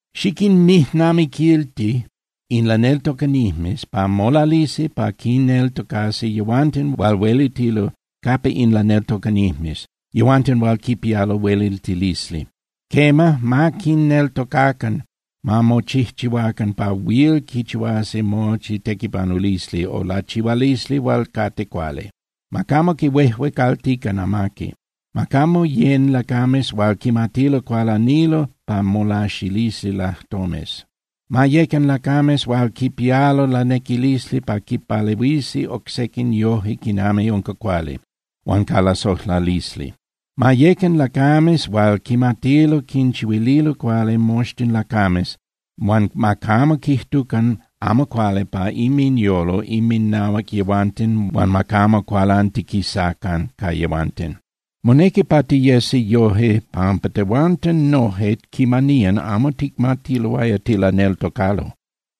Xiquinmijnamiquilti in laneltocanijmes pa molalisi pa quinneltocasi yehuanten hual huelitilo capa in laneltocanijmes, yehuanten hual quipialo hueliltilisli. Quema, ma quinneltocacan, ma mochijchihuacan pa huil quichihuasi mochi tequipanulisli o lachihualisli hual cate cuali. Ma camo quihuejuecaltican amaqui. Ma camo yén (yecan) lacames hual quimatilo cualanilo pa molaxilisi lajtomes. Ma yecan lacames hual quipialo lanequilisli pa quinpalehuisi oc sequin yoje quinami unca cuali, huan ca lasojlalisli. Ma yecan lacames hual quimatilo quinchihuililo cuali moxtin lacames huan ma camo quijtucan amo cuali pa inminyolo inminahuac yehuanten huan ma camo cualantiquisacan ca yehuanten. Monequi pa tiyesi yoje pampa tehuanten noje quimaniyan amo ticmatiloaya tilaneltocalo.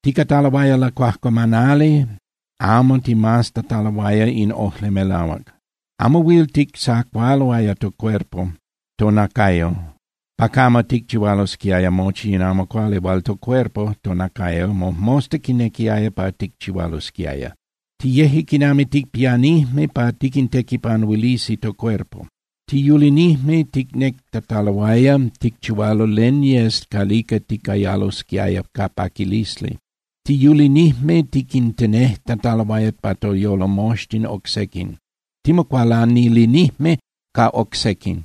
Ticataloaya lacuajcuamanali amo ticmaztataloaya in ojli melahuac. Amo huil tictzacualoaya tocuerpo (tonacayo) pa camo ticchihualosquiaya mochi in amo cuali hual tocuerpo (tonacayo) mojmosta quinequiaya pa ticchihualosquiaya. Tiyeje quinami ticpianijme pa tiquintequipanuilisi tocuerpo. Tiyulinijme ticnectataloaya ticchihualo len yes calica ticayalosquiaya ca paquilisli. Tiyulinijme tiquintenejtataloaya pa toyolo moxtin oc sequin. Timocualanilinijme ca oc sequin,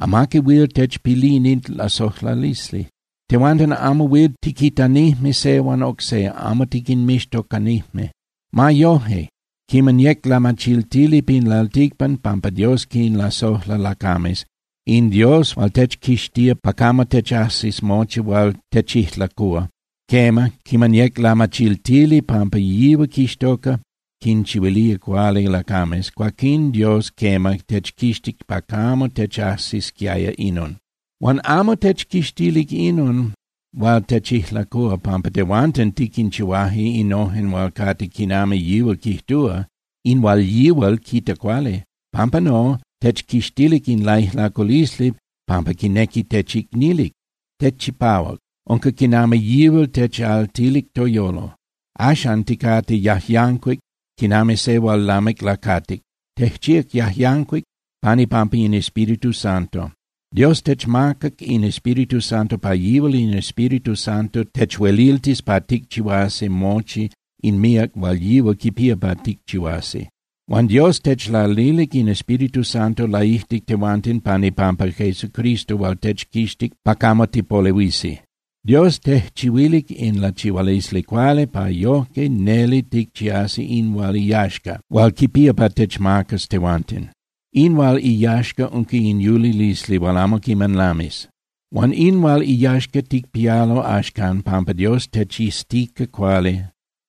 amaqui huil techpilini lasojlalisli. Tehuanten amo huil tiquitanijme se huan oc se, amo tiquinmixtocanijme. Ma yoje, quiman yec lamachiltili pin lalticpan pampa Dios quinlasojla lacames, in Dios hual techquixtía pa camo techajsis mochi hual techijlacúa, quema, quiman yec lamachiltili pampa yihual quixtoca quinchihuilía cuali lacames, cuaquín Dios, quema, techquixtic pa camo techajsisquiaya inon. Huan amo techquixtilic inon hual techijlacúa pampa tehuanten tiquinchihuaje innojen hual cate quinami yihual quijtúa, in hual yihual quita cuali. Pampa no, techquixtilic in laijlaculisli pampa quinequi techicnilic. Tejchipahuac, unca quinami yihual techaltilic toyolo. Axcan ticate yajyancuic quinami se hual lamic lacatic. Tejchíac yajyancuic pan ipampa in Espíritu Santo. Dios techmacac in Espíritu Santo pa yihual in Espíritu Santo techueliltis pa ticchihuasi mochi in míac hual yihual quipía pa ticchihuasi. Huan Dios techlalilic in Espíritu Santo laijtic tehuanten pan ipampa Jesucristo hual techquixtic pa camo tipolehuisi. Dios tejchihuilic in lachihualisli cuali pa yojque neli ticchiasi in hual iyaxca hual quipía pa techmacas tehuanten. In hual iyaxca unca in yulilisli hual amo quiman lamis. Huan in hual iyaxca ticpialo axcan pampa Dios techiztica cuali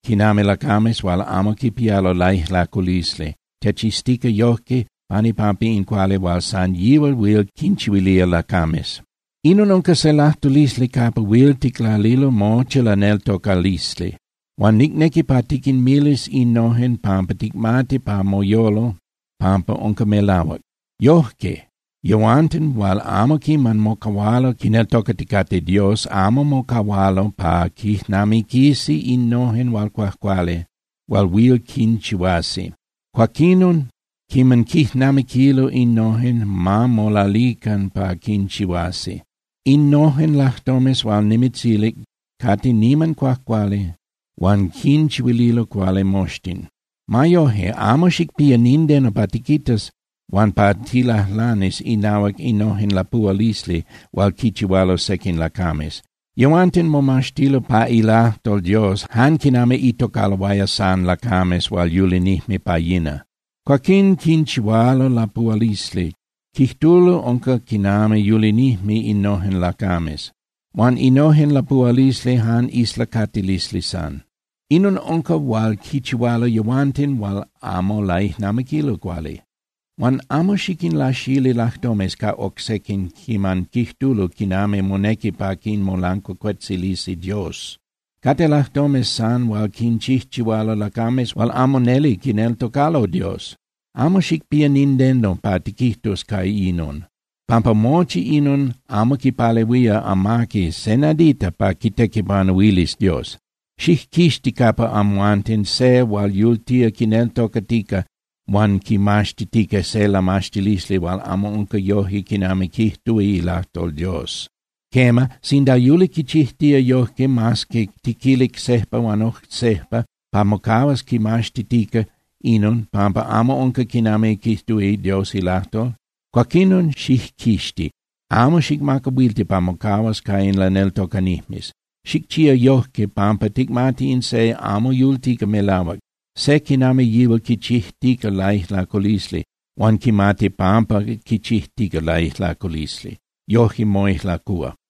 quinami lacames hual amo quipialo laijlaculisli, techiztica yojque pan ipampa in cuali hual san yihual huil quinchihuilía lacames. Inon unca se lajtulisli capa huil ticlalilo mochi laneltocalisli. Huan nicnequi pa tiquinmilis innojen pampa ticmati pa moyolo pampa unca melahuac. Yojque yehuanten hual amo quiman mocahualo quineltocaticate Dios amo mocahualo pa quijnamiquisi innojen hual cuajcuali hual huil quinchihuasi. Cuaquinon quiman quijnamiquilo innojen, ma molalican pa quinchihuasi. Innojen lajtomes hual nimitzilic cate niman cuajcuali huan quinchihuililo cuali moxtin. Ma yoje, amo xicpía nindeno pa tiquitas huan pa tilajlanis inahuac innojen lapuhualisli hual quichihualo sequin lacames. Yehuanten momaxtilo pa ilajtol Dios jan quinami itocaloaya san lacames hual yulinijme pa yina. Cuaquín quinchihualo lapuhualisli, quijtulo unca quinami yulinijme innojen lacames. Huan innojen lapuhualisli jan islacatilisli san. Inon unca hual quichihualo yehuanten hual amo laijnamiquilo cuali. Huan amo xiquinlaxili lajtomes ca oc sequin quiman quijtulo quinami monequi pa quinmolancuacuetzilisi Dios. Cate lajtomes san hual quinchijchihualo lacames hual amo neli quineltocalo Dios. Amo xicpía nindeno pa tiquijtus ca inon, pampa mochi inon amo quipalehuía amaqui se nadita pa quitequipanuilis Dios. Xijquixti capa amhuanten se hual yultía quineltocatica huan quimaxtitica se lamaxtilisli hual amo unca yoje quinami quijtúa ilajtol Dios. Quema, sinda yuli quichijtía yojque mas que tiquilic sejpa huan oc sejpa pa mocahuas quimaxtitica inon pampa amo unca quinami quijtúa Dios ilajtol, cuaquinon xijquixti. Amo xicmacahuilti pa mocahuas ca in laneltocanijmes. Xicchía yojque pampa ticmati in se amo yultica melahuac. Se quinami yihual quichijtica laijlaculisli, huan quimati pampa quichijtica laijlaculisli, yojque moijlacúa.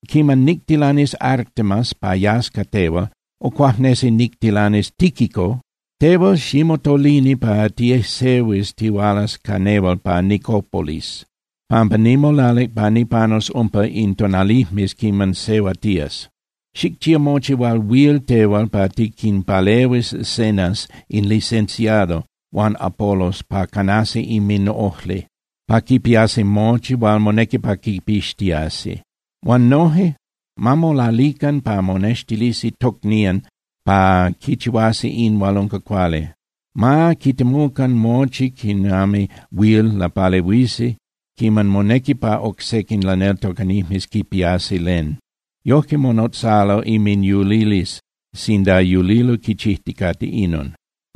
Quiman nictilanis Artemas pa yas ca tehual, o cuajnesi nictilanis Tíquico, tehual ximotolini pa tiejsehuis tihualas ca nehual pa Nicópolis, pampa nimolalic pa nipanus umpa in tonalijmes quiman sehuatías. Xicchía mochi hual huil tehual pa tiquinpalehuis Zenas in licenciado huan Apolos pa canasi inminojli, pa quipiasi mochi hual monequi pa quipixtiasi. Huan noje, ma molalican pa monextilisi tocnían pa quichihuasi in hual unca cuali. Ma quitemucan mochi quinami huil lapalehuisi quiman monequi pa oc sequin laneltocanijmes quipiasi len. Yojque monotzalo inminyulilisli sinda yulilo quichijticate inon.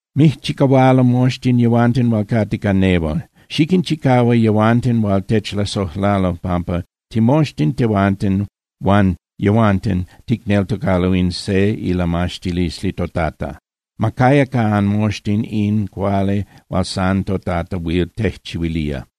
Mijchicahualo moxtin yehuanten hual cate ca nehual. Xiquinchicahua yehuanten hual techlasojlalo pampa timoxtin, tehuanten huan yehuanten ticneltocalo in se ilamaxtilisli toTata. Ma caya ca anmoxtin in cuali hual san toTata huil tejchihuilía.